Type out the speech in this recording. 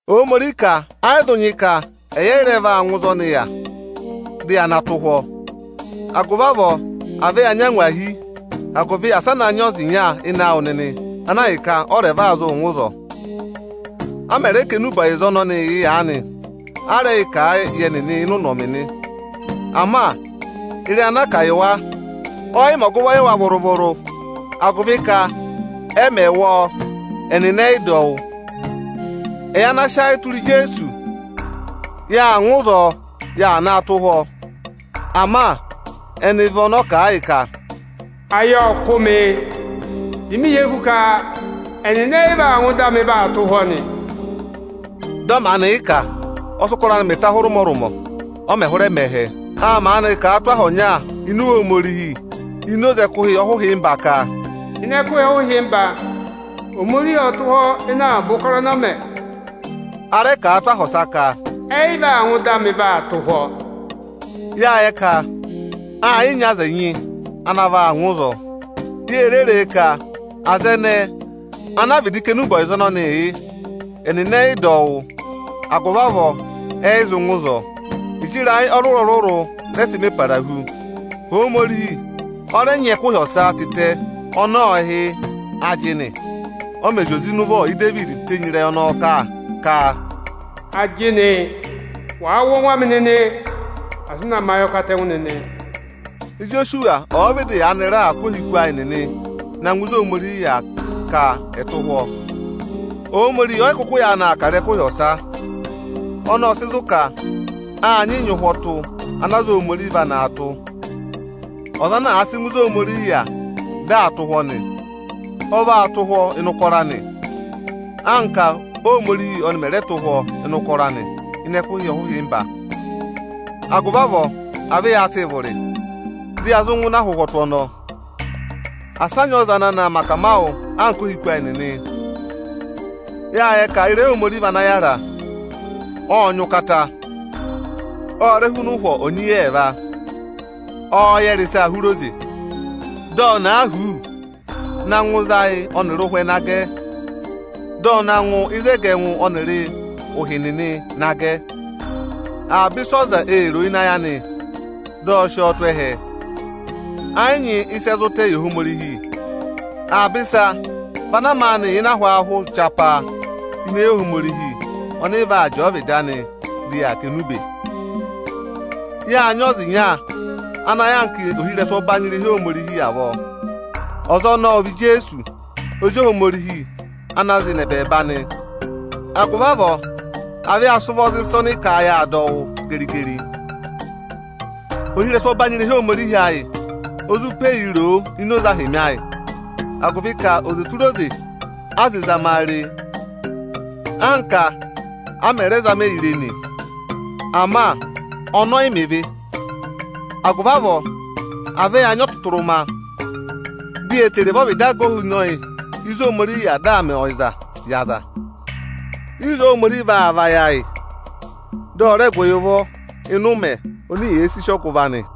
Ohomorihi ka ẹ́ yị zụ nyị ka ẹyị ẹ́ yị rẹ vaa ngụ ịzị ọnị yà, dị ya na tụ́ ụhwọ́. Agụvị avọọ à vẹ ya nyị angwahi, agụvị asị a na nyị ọza ịnya ịnị awụ nịnị ana ahịka ọ rẹ va zụ ngụ ịzọọ. A ma rẹ kà enube ọyịza ọnọnịị yị aanị, a rẹ kà a yị ẹnị ịnị ụnọmị nị. Ama ịrẹyị ana a kà yị wa ẹ yị mẹ ọgụvọ yị wa vụrụ-vụrụ, agụvị ka ẹ mẹ̀ wụ́ ọ, ẹnịnị ẹ yị dọ ọ wụ́. Ẹyị ana sị ayị tụra Ijeesu, ọ ngụ ịzị ọ yà naa tụ́ ụhwọ́ nị. Ama ẹnị vị ọnị ọ́ kà a yị ka: Ayị ọ́ kụ́ ọnị, dị ọnị hị́ eku ka ẹnịnị ẹ yị vaa ngụ ịdị anị vaa tụ́ ụhwọ́ nị. Dị ọ maanị yị kà, ọ sị ụkọrọ anị mẹ ta hụrị ụmọrụmọ, ọ mẹ̀ hụrẹ mẹ ẹhẹ. Â maanị kà a tụ́ aha ọnya ini Iwe Ohomorihi ini oze ẹkụhị ọhụhịmba ka: Ịnị ẹkụhị ọhụhịmba, Ohomorihi ộ tụ́ ụhwọ́ ịnị avaba ụkọrọ ọnị ọ mẹ. A rẹ kà a tụ́ aha ọsa ka: Ẹyị vaa ngụ ịdị anị vaa tụ́ ụhwọ́. Yáa yẹ ka aa yị nyị aza ẹnyị ana vaa ngụ ịzọọ. Ye re ree ka aza ẹnẹẹ ana a vịdị kà enube ọyịza ọnọnịị yị, ẹnịnị ẹ yị dọ ọ wụ́, agụvị avọọ ẹnịnị ẹ yị zụ ngụ ịzọọ. Ịjị ịrayị ọrụrụ-ọrụrụ rẹ sị mẹ para hu, Ohomorihi ọ rẹ nyị ẹkụhị ọsa tịtẹ ọnị ọ hị́ ajịnị, ọ mẹ̀ zị oze ịnị ụvọ Idevidi tenyi ịrẹyị ọnọọ kà ka: Ajịnị, wàa wụ́ ọngwẹ anị nịnị, asị ụ na mẹ ayọkatẹngụ nịnị. Ijosuwa ọ̀ọ vịdị yaanị raà kụ́ ohiku ayị nịnị na ngụ ịnị ịzị Ohomorihi yà ka ẹ̀ẹ tụ́ ụhwọ́, Ohomorihi ọ́ yị kụkụ yaanị aa kà ịrẹyị ẹkụhị ọsa. Ọnọọ ọ́ọ sị zụ̀ ka a nyị nyị ụhwọtụ ana aza Ohomorihi va naa tụ́. Ọza ana àa sị ngụ ịzị Ohomorihi yà dị aa tụ́ ụhwọ́ nị, ọ vaa tụ́ ụhwọ́ ịnị ụkọrọ anị, anka Ohomorihi ọnị mẹ̀ rẹ tụ́ ụhwọ́ ịnị ụkọrọ anị ịnị ẹkụhị ọhụhịmba. Agụvị avọọ, à vẹ yaa sịị vụrị, dị ya zụ ngụ ịnị ụhwọtụ ọnọọ. Asị a nyị ọza ana na mẹ akamawụ anka ohiku ayị nịnị. Yáa yẹ ka ịrẹyị Ohomorihi vị ana yára. Ọ́ọ nyị ụkata, ọ́ọ rẹ́ huna ụhwọ onyeyi ẹẹva. Ọọ̄ yẹrẹ ịsaa hụrị oze, dị ọ na huuu na ịzị ayị ọnịrị ụhwẹ na gẹ. Dị ọ na ngụ ịzị ẹgẹ ẹngụ ọnịrị ụhị nịnị na gẹ. Avaba ịsị ọza èe ro ịnị ayị anị, dị ọ sị ọ tụ́ ẹhẹ. Ẹ yị nyị ịsị ẹ zụ tẹ̀ yị Ohomorihi. Avaba ịsa vị ana maanị yà ịnị ahwaahụ chapaa ini eyi Ohomorihi ọnị vaa jẹẹ ọvịdị anịị kà enube. Yaa nyị ọza ịnya ana yà anka ohirẹsụ ọbanyị irehi Ohomorihi avọọ. Ọza ọnọọ ọ vị Ijeesu Ozi Ohomorihi ana zị nọ ẹbẹẹba nị. Agụvị avọọ, à vẹ ya sị ụvọ za ịsa ọnị ka yaa dọ wụ́ geri-geri. Ohirẹsụ ọbanyị irehi Ohomorihi ayị o zụ pe yi roo ini oze ahịmị ayị, agụvị ka oze tụra oze a zị zama a re, anka a mẹ̀ raa zama ẹyịị re nị, ama ọnị ẹ yị mẹ ịvị. Agụvị avọọ, à vẹ ya nyị ọtụtụrụma, di ye tere vẹ ọvịdị aga ohinọyị ịzị Ohomorihi yà dị aa mẹ ọyịzaa yị aza. Ịzọọ Ohomorihi vaa vayị ayị, dị ọ rẹ gụ yị ụvọ ịnị ụmẹ oni yèe sì ọgụvọ nị.